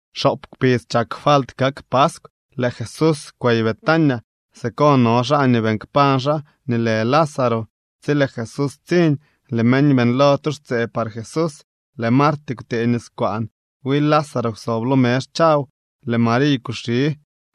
Xoop kpidz chak falt kak paskw, lëë Jesús kwey Betania. Siko no xaa nii beeñ kpañ xaa nii lë Lázaro. Tsi lëë Jesús ptsiñ, lëë meñ beeñlo tu xtsee par Jesús. Lëë Marty kwtëë niskwaan. Wi Lázaro kwsob lo mezh chaw. Lëë Mariy kuxi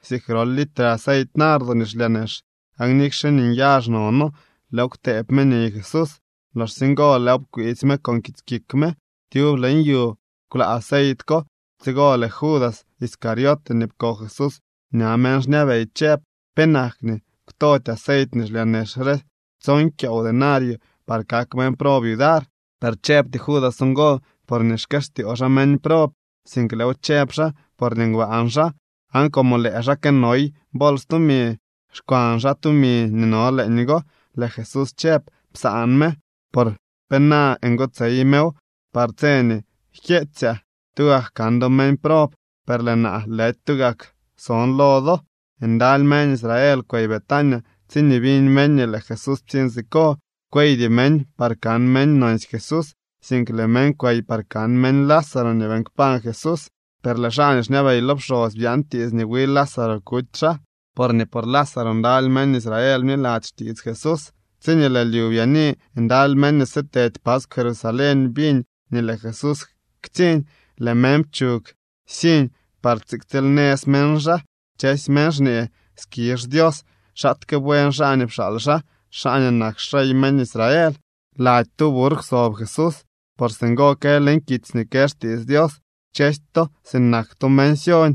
siik grol litre aceit nardo nii xlyaa nex. Aan nikxe nii nyazh nono, lëëw kwtëëb me niy Jesús. Loxsye ngo lëëw pkwiitsy me con kits kik me. Tyub leñ yu kwlaa aceit ko. Tsigo lëë Judas Iscariote nii pko Jesús ña meñ xñabey chëb: —¿Penak nii kwtody aceit nii xlyaa nex re tson kyoow denario par kak meñ prob yudar? Per chëbty Judas ngo porñee xkëstyoo xaa meñ prob, sink lëëw chëb xaa porñee ngbaan xaa, aan como lëë xaa kënoy bols tumi, xkwan xaa tumi nii no leeñgo. Lëë Jesús chëb: —Psaan me, por pena ngotsey mew par tse nii jkyeetsyaa. Tugak kan do meñ prob, per lëë naa, lëdy tugak son lo do. Ndaly meñ Israel kwey Betania tsiñee biñ meñ nii lëë Jesús ptsiñ siko. Kweydy meñ par kan meñ nonsy Jesús, sink lëë meñ kwey par kan meñ Lázaro nii beeñ kpañ Jesús. Per lëë xaa nii xñabey lo pxosy byaan tiits nii wi Lázaro kuty xaa, porñee por Lázaro ndaly meñ Israel bniladzy xtiits Jesús. Tsi lëë lyu byaani ndaly meñ nii sitedy paskw Jerusalén biñ nii lëë Jesús ktsiñ. Lëë meñ pchug siñ par tsiktsiilnëz meñ xaa. Kchësy meñ xñee: —¡Skizh Dios! ¡Xaatke buen xaa nii pxaal xaa, xaa nii kak xrey meñ Israel! Lady tu burr kwsob Jesús, por singo kë leñ kitsy nii kë xtiits Dios: Kchësy to sinak to meñ Sión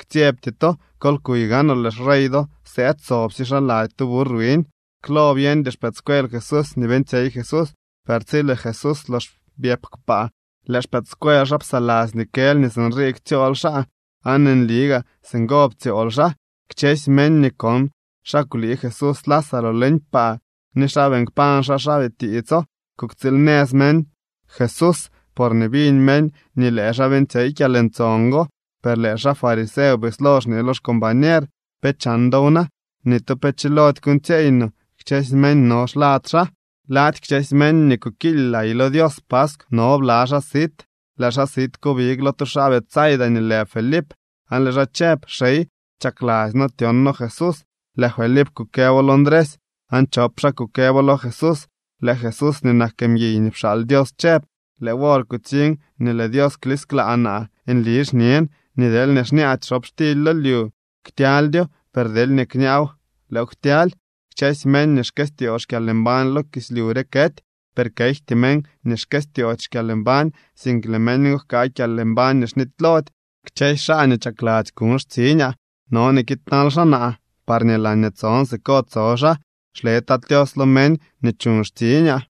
ktsyebty to. Kol kuy gaanoo lëë xrey do sëëd sobsye xaa lady tu burr wiñ. Klo byeñdy xpëëdscuel Jesús nii beeñtsyey Jesús, per tsi lëë Jesús lox byëp kpaa, lëë xpëëdscuel xaa psaladzy nii kël nii sinrii ktsyool xaa aan nli gaa singo ptsyool xaa. Kchësy meñ nii kon xa kwlii Jesús Lázaro leñ paa ni xa beeñ kpañ xaa xaa bitiitso. Kuktsiil nëz meñ Jesús porñee biñ meñ nii lëë xaa beeñtsyey kyalntson go. Per lëë xaa fariseo bislo xñee lo xcombañer: —¿Pe chan dow na? Ni tu pe chilody kuuñtsyeey no. Kchësy meñ no xlad xaa. Lady kchësy meñ nii kukiily lay lo Dios paskw no bla xaa sit. Lëë xaa sit ko big lo tu xaa Betsaida nii lë Felip aan lëë xaa chëb: —Xey, chakladzy noo tyon noo Jesús. Lëë Felip kukëbo lo Ndresy, aan chop xaa kukëbo lo Jesús. Lëë Jesús nii nak mguiy nii pxaal Dios chëb: —Lëë wor kutsiñ nii lëë Dios klisklaa naa. Nli xñen nii deelñee kñaady xobxtily lo lyu, ktyaldyo, per deelñee kñaaw, lëëw ktyaly. Kchësy meñ nii xkëstyoo xkyalmbañ lo kislyu re kety, per kejty meñ nii xkëstyoody xkyalmbañ, sink lëë meñ go jkaa kyalmbañ nii xnitylody. Kchësy xaa nii chakladzy kuñ xtsiñaa no nii kiidnal xaa naa parñee laañee tson siko tso xaa. Xle Tat Tios lo meñ nii chuñ xtsiñaa.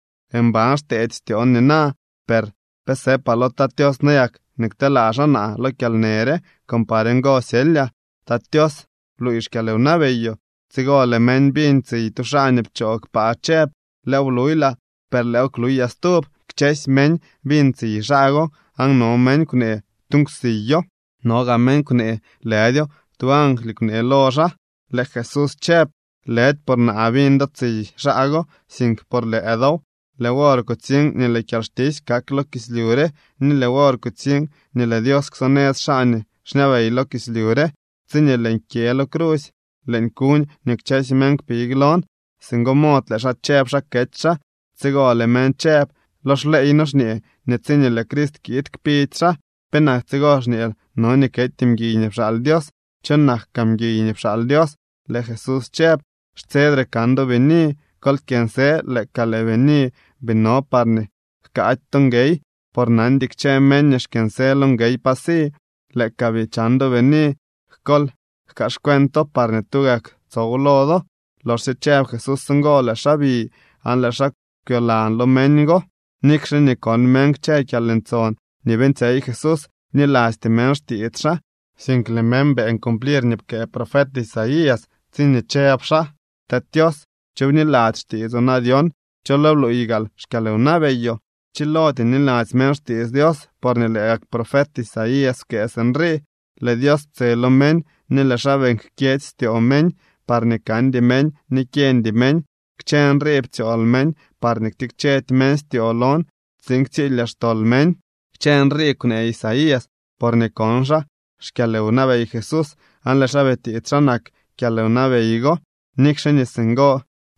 ’Mban xteedy styoon nina, per ¿pe sëpaa lo Tat Tios nayak nii kteelaa xaa naa lo kyalnë re con par ngo syelyaa? Tat Tios, bluuy xkyalwnabeyoo. Tsigo lëë meñ biñ tsiy tu xaa nii pchoo kpaa chëb: —Lëëw bluylaa, per lëëw kluyaa stub. Kchësy meñ biñ tsiy xaa go aan no meñ kwnee: —Tu nkwsiyo. No gaa meñ kwnee: —Lëdyo, tu angly kwnee lo xaa. Lëë Jesús chëb: —Lëdy por naa biñ do tsiy xaa go, sink por lëë dow. Lëë wor kutsiñ nii lëë kyalxtisy kak lo kislyu re, ni lëë wor kutsiñ nii lëë Dios ksonëz xaa nii xñabey lo kislyu re. Tsiñee lëën kyë lo crusy, lëën kuñ nii kchësy meñ kpig lon. Singo mod lëë xaa chëb xa kety xaa. Tsigo lëë meñ chëb: —Lo xleey noo xñee nii tsiñee lëë Crist kiid kpidy xaa. ¿Penak tsigo xñeel no nii kety mguiy nii pxaal Dios? Cho nak kaa mguiy nii pxaal Dios. Lëë Jesús chëb: —Xtsedre kan do bini. Kol kyënsë lëë ka lëë bini bii no parñee jkaady to nguey, por nandy kchë meñ nii xkyënsë lo nguey pa si. Lëë ka bii chan do bini, kol jkaaxcuento parñee tugak tsow lo do. Loxsye chëb Jesús ngo lëë xaa bi aan lëë xaa kwyolan lo meñ go. Nikxe nii kon meñ kchë kyalntson nii beeñtsyey Jesús, bnilasty meñ xtiits xaa, sink lëë meñ beeñ cumplir nii pkëë profet Isaías tsiñee chëb xaa: Tat Tios, ¿cho bniladzy xtiitsoo na dyon? ¿Cho lo bluuy gaal xkyalwnabeyoo? Pchilody niladzy meñ xtiits Dios, porñee lë gak profet Isaías pkëë sinrii: Lëë Dios ptse lo meñ ni lëë xaa beeñ jkyedzy styoo meñ, parñee kandy meñ ni kyeñdy meñ. Kchë nrii ptsyool meñ parñee ktikchedy meñ styoo lon, tsiin ktsilyaa xtol meñ. Kchë nrii kwnee Isaías porñee kon xaa xkyalwnabey Jesús aan lëë xaa bitiits xa nak kyalwnabey go. Nikxe nii singo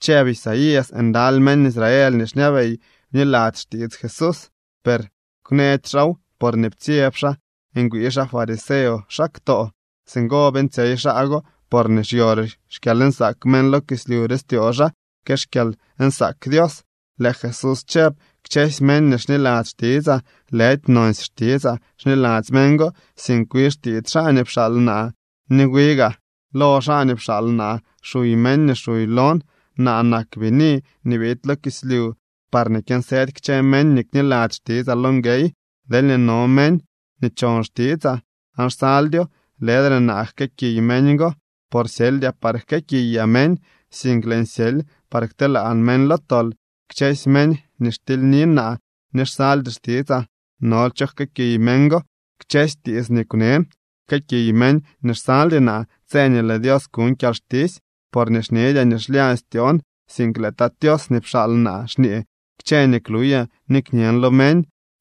chëb Isaías, ndaly meñ Israel nii xñabey bniladzy xtiits Jesús, per kwneedy xaaw porñee ptsyeb xaa ngwii xaa fariseo xaa ktoo. Singo beeñtsyey xaa go porñee xyore xkyalnsaak meñ lo kislyu re styoo xaa que xkyalnsaak Dios. Lëë Jesús chëb: —Kchësy meñ nii xniladzy xtitsaa lëdy nonsy xtitsaa xniladzy meñ go, sink wi xtiits xaa nii pxaal naa. Ni wi gaa lo xaa nii pxaal naa xuy meñ nii xuy lon. Naa nak bini nii biid lo kislyu parñee kyënsëdy kchë meñ nii kniladzy xtitsaa lo nguey. Deel no meñ nii chon xtitsaa aan xsaldyo, lëdre naa jkëëkiy meñ go, por xsyeldyaa par jkëëkiyaa meñ, sink lëën syely par kteelaan meñ lo tol. Kchësy meñ nii xtilyni naa ni xsaldy xtitsaa nol cho jkëëkiy meñ go. Kchësy tiits nii kwnën jkëëkiy meñ nii xsaldy naa tse nii lëë Dios kuñ kyalxtisy. Porque xñedyaa nii xlyañ styoon, sink lëë Tat Tios nii pxaal naa xñee kchë nii kluyaa ni kñen lo meñ.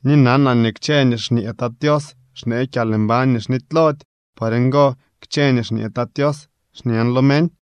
Ni nanaa nii kchë nii xñee Tat Tios xnee kyalmbañ nii xnitylody. Por ngo, kchë nii xñee Tat Tios xñen lo meñ.